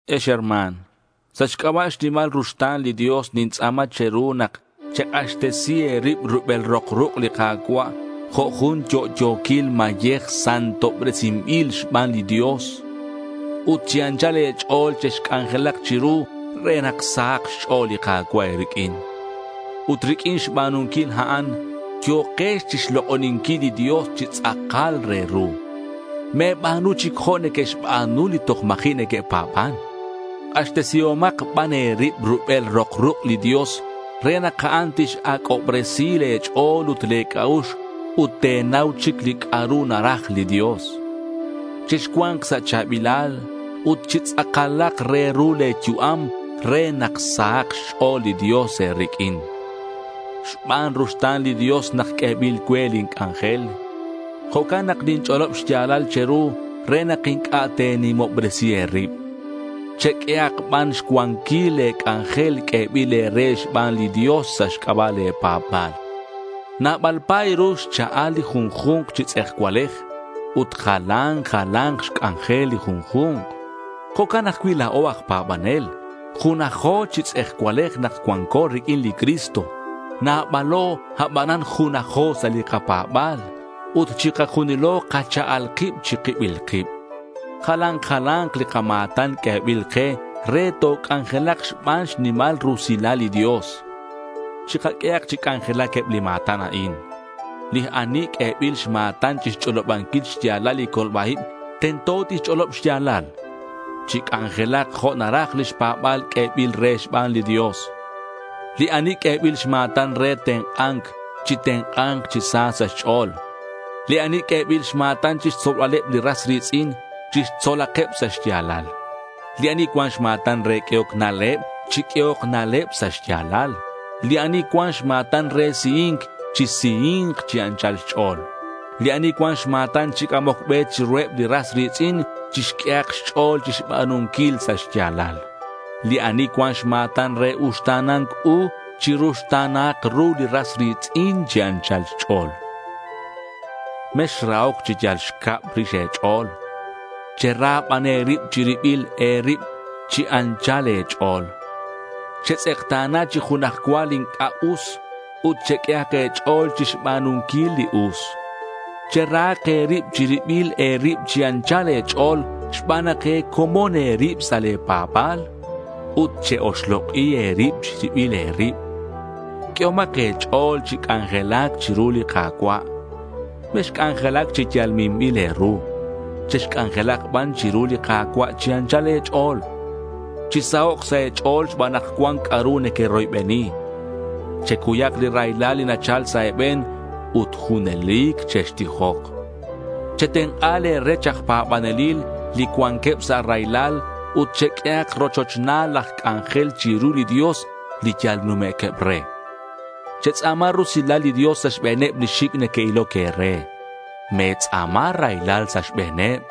Ex herma̱n, sa' xc'aba' xnimal ruxta̱n li Dios nintz'a̱ma che̱ru nak chek'axtesi e̱rib rubel rok ruk' li Ka̱cua' jo' jun yo'yo̱quil mayej santobresinbil xban li Dios, ut chi anchal e̱ch'o̱l chexc'anjelak chiru re nak sahak xch'o̱l li Ka̱cua' e̱riq'uin. Ut riq'uin xba̱nunquil a'an, yo̱kex chixlok'oninquil li Dios chi tz'akal re ru. Me̱ba̱nu chic jo' neque'xba̱nu li toj ma̱ji' neque'pa̱ban. K'axtesihomak ban e̱rib rubel rok ruk' li Dios re nak a'an tix-ac'obresi le̱ ch'o̱l ut le̱ c'a'ux, ut te̱nau chic li c'a'ru naraj li Dios. Chexcua̱nk sa' cha̱bilal, ut chi tz'akalak re ru le̱ yu'am re nak sahak xch'o̱l li Dios e̱riq'uin. Xban ruxta̱n li Dios nak q'uebil cue lin c'anjel. Jo'can nak ninch'olob xya̱lal che̱ru re nak inc'a' te̱nimobresi e̱rib. Cheq'uehak ban xcuanquil le̱ c'anjel q'uebil e̱re xban li Dios sa' xc'aba' le̱ pa̱ba̱l. Nabal pa̱y ru xcha'al li junju̱nk chi tz'ejcualej, ut jalan jala̱nk xc'anjel li junju̱nk. Jo'can ajcui' la̱o aj pa̱banel. Junajo chi tz'ejcualej nak cuanco riq'uin li Cristo. Nabalo, abanan junajo sa' li kapa̱ba̱l. Ut chikajunilo kacha'al kib chi kibil kib. Jalan jala̱nk li kama̱tan q'uebil ke re toc'anjelak xban xnimal rusilal li Dios. Chikaq'uehak chi c'anjelac eb li ma̱tan a'in. Li ani q'uebil xma̱tan chixch'olobanquil xya̱lal li colba-ib, tento tixch'olob xya̱lal. Chic'anjelak jo' naraj lix pa̱ba̱l q'uebil re xban li Dios. Li ani q'uebil xma̱tan re tenk'a̱nc, chitenk'a̱nk chi sa sa' xch'o̱l. Li ani q'uebil xma̱tan chixtzolbaleb li ras ri̱tz'in, chixtzolakeb sa' xya̱lal. Li ani cuan xma̱tan re q'uehoc na'leb, chiq'uehok na'leb sa' xya̱lal. Li ani cuan xma̱tan re sihi̱nc, chisihi̱nk chi anchal xch'o̱l. Li ani cuan xma̱tan chi c'amoc be chiruheb li ras ri̱tz'in, chixq'uehak xch'o̱l chixba̱nunquil sa' xya̱lal. Li ani cuan xma̱tan re uxta̱na̱nc u, chiruxta̱nahak ru li ras ri̱tz'in chi anchal xch'o̱l. Mexrahoc chi yal xcab rix e̱ch'o̱l. Chera ban e̱rib chi ribil e̱rib chi anchal e̱ch'o̱l. Chetz'ekta̱na chi junaj cua li inc'a' us ut cheq'uehak e̱ch'o̱l chixba̱nunquil li us. Cherahak e̱rib chi ribil e̱rib chi anchal e̱ch'o̱l xban nak e̱comon e̱rib sa' le̱ pa̱ba̱l. Ut che-oxlok'i e̱rib chi ribil e̱rib. Q'uehomak e̱ch'o̱l chi c'anjelac chiru li Ka̱cua'. Mexc'anjelac chi yal minbil e̱ru. Chexc'anjelak ban chiru li Ka̱cua' chi anchal e̱ch'o̱l. Chisahok' sa' e̱ch'o̱l xban nak cuan c'a'ru nequeroybeni. Checuyak li raylal li nachal sa' e̱be̱n. Ut junelic chextijok. Chetenk'a le̱ rech aj pa̱banelil li cuanqueb sa' raylal ut cheq'uehak rochochnal laj c'anjel chiru li Dios, li yal numequeb re. Chetz'a̱ma rusilal li Dios sa' xbe̱neb li xic' neque'iloc e̱re. Me̱tz'a̱ma raylal sa' xbe̱neb.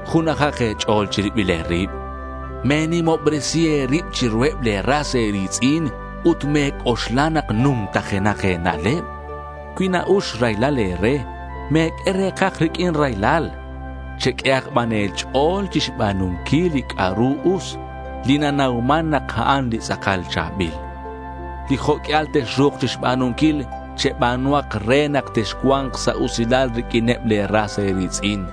Junajak e̱ch'o̱l chi ribil e̱rib. Me̱nimobresi e̱rib chiruheb le̱ ras e̱ri̱tz'in, ut me̱c'oxla nak numtajenak e̱na'leb. Cui na-ux raylal e̱re, me̱q'ue re̱kaj riq'uin raylal. Cheq'uehak ban e̱ch'o̱l chixba̱nunquil li c'a'ru us, li nanauman nak a'an li tz'akal cha̱bil. Li jo' q'uial texru̱k chixba̱nunquil, cheba̱nuhak re nak texcua̱nk sa' usilal riq'uineb le̱ ras e̱ri̱tz'in.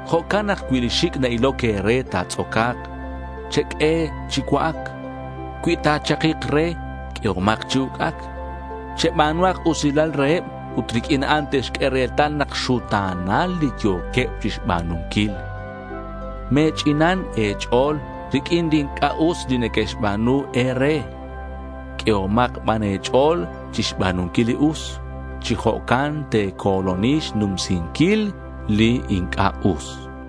Jo'can nak cui li xic' na-iloc e̱re ta̱tz'oca̱k, cheq'ue chi cua'ac. Cui ta̱chakik re, q'uehomak chi uc'ac. Cheba̱nuhak usilal reheb ut riq'uin a'an te'xq'ue retal nak xuta̱nal li yo̱queb chixba̱nunquil. Me̱ch'inan e̱ch'o̱l riq'uin li inc'a' us li neque'xba̱nu e̱re. Q'uehomak ban e̱ch'o̱l chixba̱nunquil li us. Chi jo'can te̱co̱loni xnumsinquil li inc'a' us.